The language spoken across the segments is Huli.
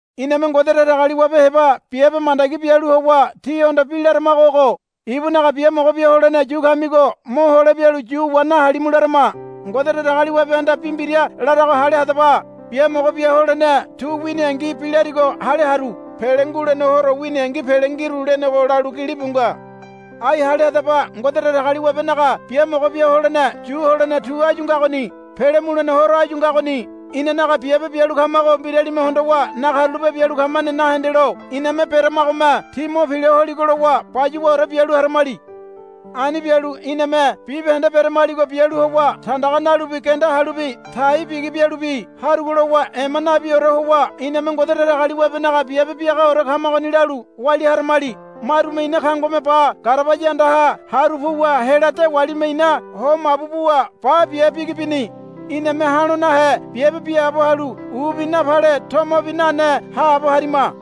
Iname Ngode Datagaliwabe heba biabe mandagi bialu howa tíhondo bi laramago ogo. Ibunaga biamogo bia holene yu kamigo mohole bialu yu wa nahalimu larama. Ngode Datagaliwabehanda bi mbira larago hale hadaba. Biamogo bia holene tu winingi bi larigo hale haru. Pele ngulene horo winingi pele ngiru, lenego lalu gilibu nga. Ai hale hadaba. Ngode Datagaliwabenaga biamogo bia holene yu holene tu áyu ngagoni. Pele mulene horo áyu ngagoni. Inanaga biabe bialu kamago mbiralime hondowa nakarulape bialu kamane nahendelo iname beramagome ti mo pila holigo lowa bayuwaore bialu haramali. Ani bialu iname bibahende beremaligo bialu howa tandaga nalubi genda halubi tai bigi bialubi harugo lowa ema nabiore howa iname Ngode Datagaliwabenaga biabe biagaore kamagoni lalu walia haramali. Marume ina kangome ba garabaya andaha haru puwa hela dewalime ina ho mabu buwa ba bia bigi bini. Iname ha̱lo nahe biabe biaabo halu ubi napale tomobi nane haabo harima.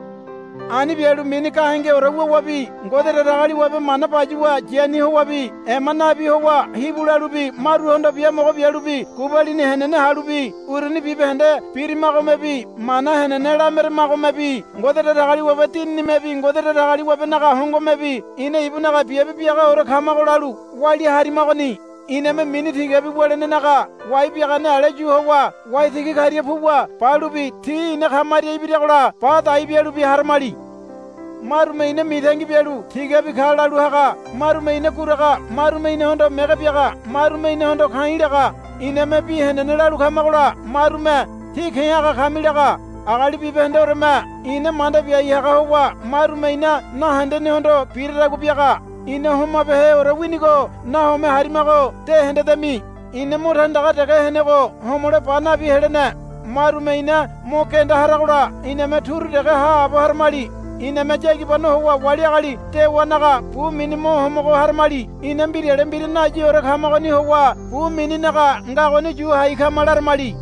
Ani bialu mini gahengeore wuwabi Ngode Datagaliwabe mana bayuwa yani howabi ema nabi howa hibu lalubi maruhondo biamogo bialubi gubalini henene halubi uruni bibahende birimagomebi mana henene lameramagomebi Ngode Datagaliwabe Dininimebi Ngode Datagaliwabenaga hongomebi ina ibunaga biabe biagaore kamago lalu walia harimagoni. Iname mini tigabi wulenenaga wai biagane ale yu howa waitigi karia puwa balubi ti ina kamaria ibiragola ba dai bialubi haramali. Marume ina mitangi bialu tigabi ka lalu haga marume ina guraga marume inahondo mege biaga marume inahondo ka̱i̱ laga. Iname bi henene lalu kamagola marume. Tí ke̱ haga kami, laga. Agali bibahendeoreme ina manda biai haga howa marume ina nahendenehondo biradagua biaga. Ina homabeheore winigo nahome harimago dehendedemi. Ina mo tandaga dege henego homole ba nabi helene. Marume ina mo genda haragola iname turu dege haabo haramali. Iname yagibano howa wali agali dewanaga bu mini mo homogo haramali. Ina mbirale mbira nayiore kamagoni howa bu mininaga ngagoni yu hai kama, laramali.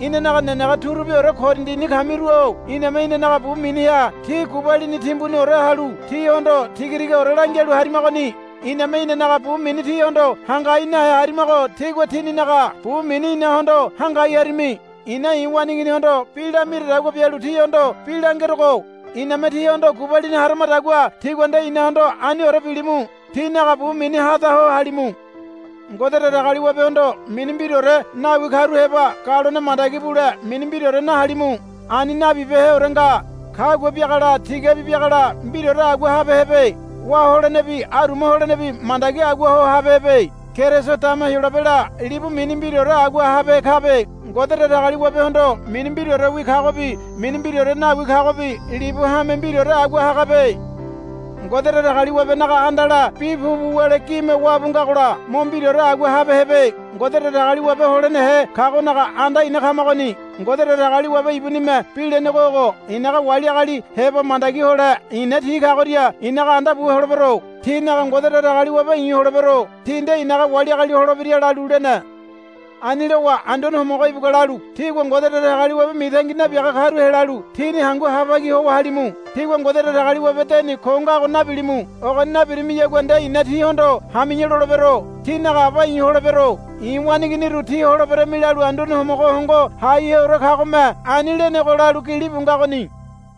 Inanaga nenege turubiore Korindini kamiru-o iname inanaga bu miniha tí gubalini timbuniore halu tíhondo tiga tigaore langialu harimagoni. Iname inanaga bu mini tíhondo hangai nahe harimago tígua tíninaga bu mini inahondo hangai harimi. I̱na i̱ waneiginihondo bi lamiradagua bialu tíhondo bi langerogo. Iname tíhondo gubalini haramadagua tígua nde inahondo aniore bilimu. Tínaga bu mini hada ho halimu. Ngode Datagaliwabehondo mini mbiraore nawi karu heba galone mandagi bule mini mbiraore nahalimu. Ani nabibeheore nga. Kagua biagala tigabi biagala mbiraore agua habehebe. Wá holenebi aruma holenebi mandagi agua ho habehebe. Keriso dama Heyolabela libu mini mbiraore agua habehe kabe. Ngode Datagaliwabehondo mini mbiraorewi kagobi mini mbiraore nawi kagobi libu hame mbiraore agua hagabe. Ngode Datagaliwabenaga andala bi pupu wule gime wabu ngagola mo mbiraore agua habehebe. Ngode Datagaliwabe holenehe kagonaga anda ina kamagoni. Ngode Datagaliwabe ibunime bi lenego ogo, I̱naga wali agali heba mandagi hole i̱na ti kagoria i̱naga anda bu holebero. Tinaga Ngode Datagaliwabe i̱ holebero. Ti nde i̱naga wali agali holebira, lalu lene. Ani lowa Anduane Homogo ibugua lalu, Tígua Ngode Datagaliwabe mitangi nabiaga karu helalu tíni hangu ha bagi howa halimu. Tígua Ngode Datagaliwabe deni ko ngago nabilimu. Ogoni nabirimiyagua nde i̱na tíhondo hami̱ya lolebero. Tínaga aba i̱ holebero. I̱ waneiginiru tí holeberami, lalu Anduane Homogo Hongo Haiheore kagome ani lenego, lalu gilibu ngagoni.